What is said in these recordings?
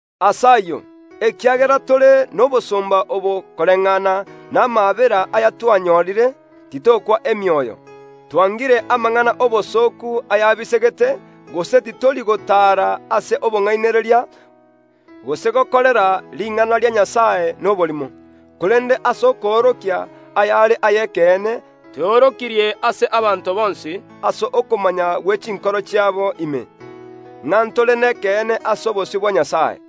Ase ayio, ekiagera tore nobosomba obo koreng’ana namaabera a Nyasae aya twanyorire, titokwa emioyo. Twangire amang’ana y’obosooku ayabisegete, gose titori gotaara ase obong’ainereria, gose gokorera ring’ana ria Nyasae noborimo. Korende ase okoorokia ayare ay’ekeene tweorokirie ase abanto bonsi ase okomanya gwe chinkoro chiabo ime, ng’a ntore nekeene ase obosio bwa Nyasae.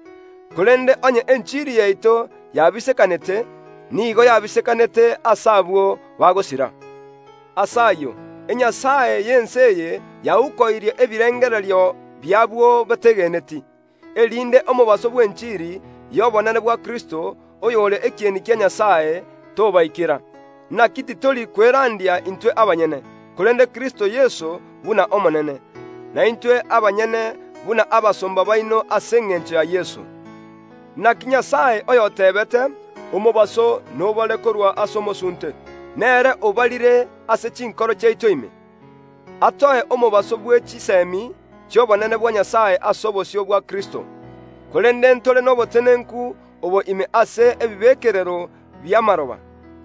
Korende onye enchiri yaito yabisekanete, nigo yabisekanete ase abwo bagosira. Ase ayio enyasae y’ense eye yaukoirie ebirengererio bi’abwo bategeneti, erinde omobaso bw’enchiri y’obonene bwa Kristo, oyore ekieni kia Nyasae, tobaikera. Naki titori kwerandia intwe abanyene, korende Kristo Yeso buna Omonene, na intwe abanyene buna abasomba baino ase engencho ya Yeso. Naki Nyasae oyoteebete, “Omobaso nobare korwa ase omosunte”, nere obarire ase chinkoro chiaito ime, atoe omobaso bwe chisemi chi’obonene bwa Nyasae ase obosio bwa Kristo. Korende ntore nobotenenku obo ime ase ebibekerero bi’amaroba,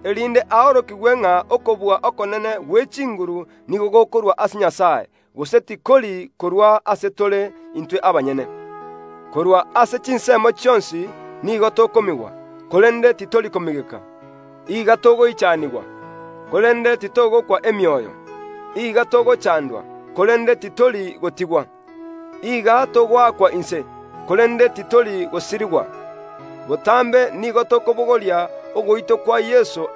erinde aorokigwe ng’a okobua okonene gwe chinguru nigo gokorwa ase Nyasae, gose tikori korwa ase tore intwe abanyene. Korwa ase chinsemo chionsi nigo tokomigwa, korende titori komigeka; iga togoichanigwa, korende titogokwa emioyo, iga togochandwa, korende titori gotigwa; iga togoakwa inse, korende titori gosirigwa. Botambe nigo tokobogoria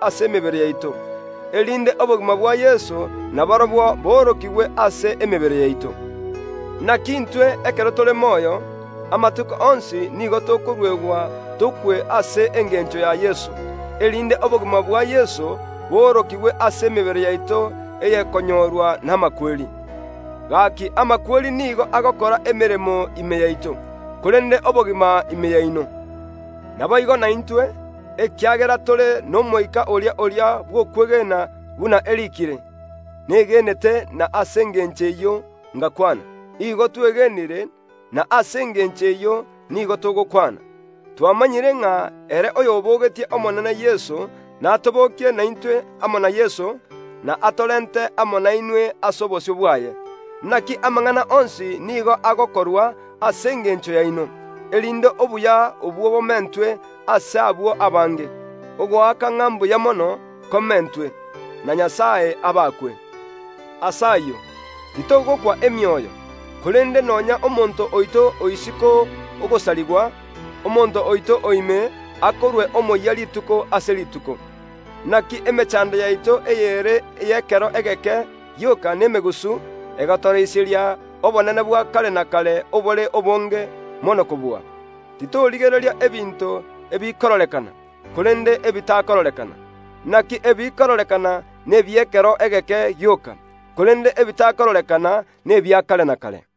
ase emebere yaito ogokwa kwa Yeso, erinde obogima bwa Yeso naborobwo boorokigwe ase emebere yaito. Naki intwe ekero tore moyo, amatuko onsi nigo tokoruegwa tokwe ase engencho ya Yeso, erinde obogima bwa Yeso boorokigwe ase emebere yaito eyekonyorwa namakweri. Gaki amakweri nigo agokora emeremo ime yaito, korende obogima ime yaino. Naboigo naintwe, ekiagera tore n’Omoika oria oria bw’okwegena buna eriikire, “Negenete, na ase engencho eyio ngakwana”, igo twegenire, na ase engencho eyio nigo togokwana. Twamanyire ng’a ere oyobogetie Omonene Yeso natobokie naintwe amo na Yeso, na atorente amo nainwe ase obosio bwaye. Naki amang’ana onsi nigo agokorwa ase engencho yaino, erinde obuya obwo bomentwe ase abwo abange, ogoaka ng’a mbuya mono komentwe, na Nyasae abakwe. Ase ayio, titogokwa emioyo; korende nonya omonto oito o isiko ogosarigwa, omonto oito o ime akorwe omoyia rituko ase rituko. Naki emechando yaito eyere y’ekero egeke gioka nemegusu, egotoroiseria obonene bwa kare na kare obore obonge mono kobua. Titorigereria ebinto ebikororekana, korende ebitakororekana; naki ebikororekana nebi’ekero egeke gioka, korende ebitakororekana nebia kare na kare.